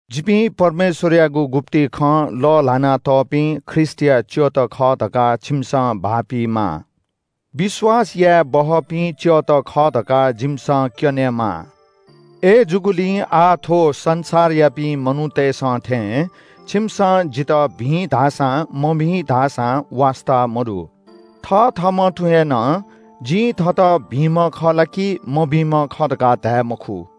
जिपिं परमेश्‍वरयागु गुप्‍ति खँ लःल्‍हाना तःपिं ख्रीष्‍टया च्‍यःत खः धकाः छिमिसं भाःपीमाः। विश्‍वास यायेबहःपिं च्‍यःत खः धकाः जिमिसं क्‍यनेमाः। अय्‌जूगुलिं आः थ्‍व संसारयापिं मनूतय्‌सं थें छिमिसं जितः भिं धाःसां मभिं धाःसां वास्‍ता मदु। थथःम्‍हं तुं हे नं जिं थःत भिंम्‍ह खः ला कि मभिंम्‍ह खः धकाः धाये मखु।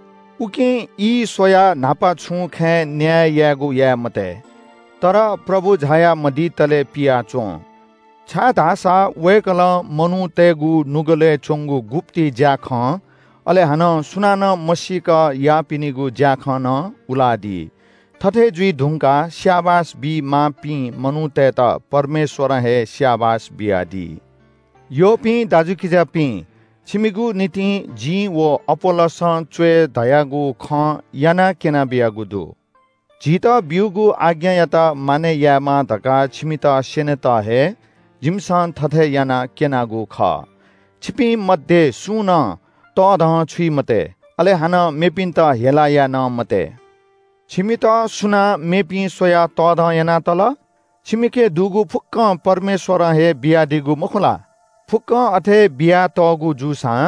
उकिं ई स्‍वयाः न्‍हापा छुं खँय् न्‍याय यायेगु याये मते। तर प्रभु झाया मदितले पियाच्‍वँ। छाय्‌धाःसा वय्‌कलं मनूतय्‌गु नुगलय् च्‍वंगु गुप्‍ति ज्‍याखँ, अले हानं सुनानं मसीक याःपिनिगु ज्‍याखँ नं उलादी। थथे जुइ धुंकाः स्‍याबास बी माःपिं मनूतय्‌त परमेश्‍वरं हे स्‍याबास बियादी। यःपिं दाजुकिजापिं, छिमिगु निंतिं जिं व अपोल्‍लोसं च्‍वय् धयागु खँ यानाः क्‍यनाबियागु दु। झीत बीगु आज्ञायात मानय् यायेमाः धकाः छिमित स्‍यनेत हे जिमिसं थथे यानाः क्‍यनागु खः। छिपिं मध्‍ये सुं नं तःधंछुइ मते, अले हानं मेपिन्‍त हेला याये नं मते। छिमित सुनां मेपिं स्‍वयाः तःधं याना तल? छिमिके दुगु फुक्‍कं परमेश्‍वरं हे बियादीगु मखु ला? फुक्‍कं अथे बियातःगु जूसां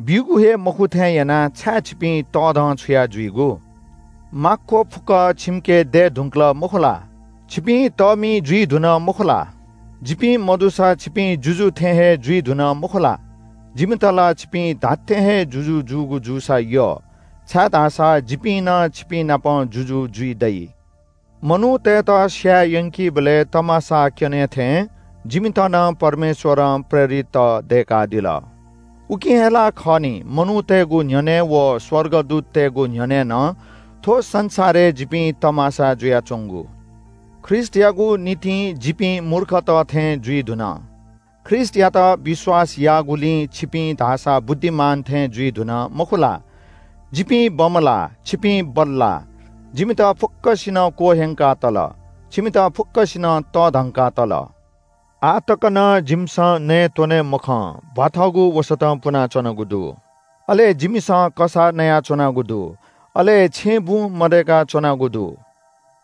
ब्‍यूगु हे मखु थें यानाः छाय् छिपिं तःधंछुया जुइगु? माक्‍व फुक्‍क छिमिके दये धुंकल मखु ला? छिपिं तःमि जुइ धुन मखु ला? जिपिं मदुसां छिपिं जुजु थें हे जुइ धुन मखु ला? जिमित ला छिपिं धात्‍थें हे जुजु जूगु जूसा यः, छाय्‌धाःसा जिपिं नं छिपिंनाप जुजु जुइ दइ। मनूतय्‌त स्‍याये यंकीबलय् तमासा क्‍यने थें जिमित नं परमेश्‍वरं प्रेरितत दय्‌कादिल। उकिं हे ला खः नि मनूतय्‌गु न्‍ह्यःने व स्‍वर्गदूततय्‌गु न्‍ह्यःने नं थ्‍व संसारय् जिपिं तमासा जुयाच्‍वंगु। ख्रीष्‍टयागु निंतिं जिपिं मूर्खत थें जुइ धुन। ख्रीष्‍टयात विश्‍वास याःगुलिं छिपिं धाःसा बुद्धिमान थें जुइ धुन, मखु ला? जिपिं बमलाः, छिपिं बल्‍लाः। जिमित फुक्‍कसिनं क्‍वह्यंका तल, छिमित फुक्‍कसिनं तःधंका तल। आः तक नं जिमिसं नयेत्‍वने मखं, भ्‍वाथःगु वसतं पुनाच्‍वनागु दु। अले जिमिसं कसाः नयाच्‍वनागु दु, अले छेँबुँ मदय्‌का च्‍वनागु दु।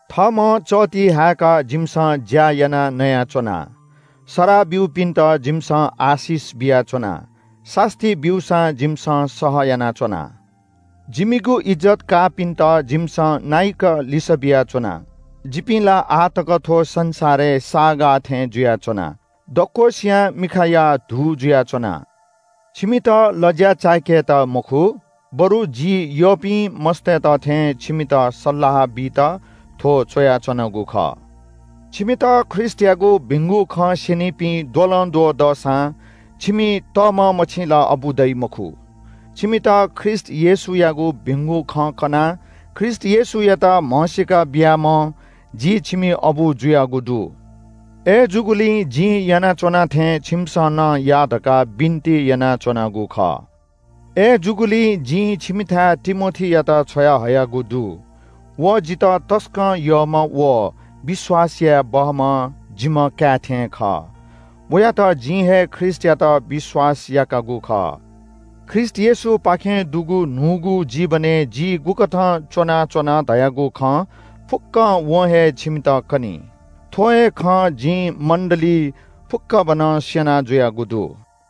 थःम्‍हं चःति हाय्‌काः जिमिसं ज्‍या यानाः नयाच्‍वना। सराः ब्‍यूपिन्‍त जिमिसं आशिष बियाच्‍वना। सास्‍ती ब्‍यूसां जिमिसं सह यानाच्‍वना। जिमिगु इज्‍जत काःपिन्‍त जिमिसं नाइक लिसः बियाच्‍वना। जिपिं ला आः तक थ्‍व संसारय् साःगाः थें जुयाच्‍वना। दक्‍वसियां मिखाया धू जुयाच्‍वना। छिमित लज्‍या चाय्‌केत मखु बरु जि यःपिं मस्‍तय्‌त थें छिमित सल्‍लाह बीत थ्‍व च्‍वयाच्‍वनागु खः। छिमित ख्रीष्‍टयागु भिंगु खँ स्‍यनीपिं द्वलंद्वः दःसां छिमि तःम्‍ह मछि ला अबु दइ मखु। छिमित ख्रीष्‍ट येशूयागु भिंगु खँ कनाः ख्रीष्‍ट येशूयात म्‍हसीका बियाम्‍ह जि छिमि अबु जुयागु दु। अय्‌जूगुलिं जिं यानाच्‍वना थें छिमिसं नं या धकाः बिन्‍ति यानाच्‍वनागु खः। अथे जूगुलिं जिं छिमिथाय् तिमोथीयात छ्वयाहयागु दु। व जितः तसकं यःम्‍ह व विश्‍वास याये बहःम्‍ह जिम्‍ह काय् थें खः। वयात जिं हे ख्रीष्‍टयात विश्‍वास याकागु खः। ख्रीष्‍ट येशूपाखें दुगु न्‍हूगु जीवनय् जि गुकथं च्‍वनाच्‍वन धयागु खँ फुक्‍क वं हे छिमित कनी। थ्‍व हे खँ जिं मण्‍डलीइ फुक्‍कभनं स्‍यना जुयागु दु।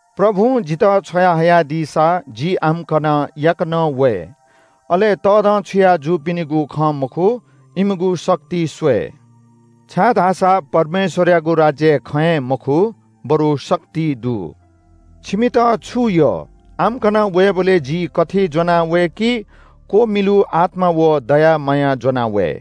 प्रभुं जितः छ्वया हयादीसा जि आम्‍कन याकनं वये। अले तःधंछुया जूपिनिगु खँ मखु, इमिगु शक्ति स्‍वये। छाय्‌धाःसा परमेश्‍वरयागु राज्‍य खँय् मखु, बरु शक्तिइ दु छिमित छु यः, आम्‍कन वयेबलय् जि कथि ज्‍वनावये कि क्‍वमिलु आत्‍मा व दया माया ज्‍वनावये?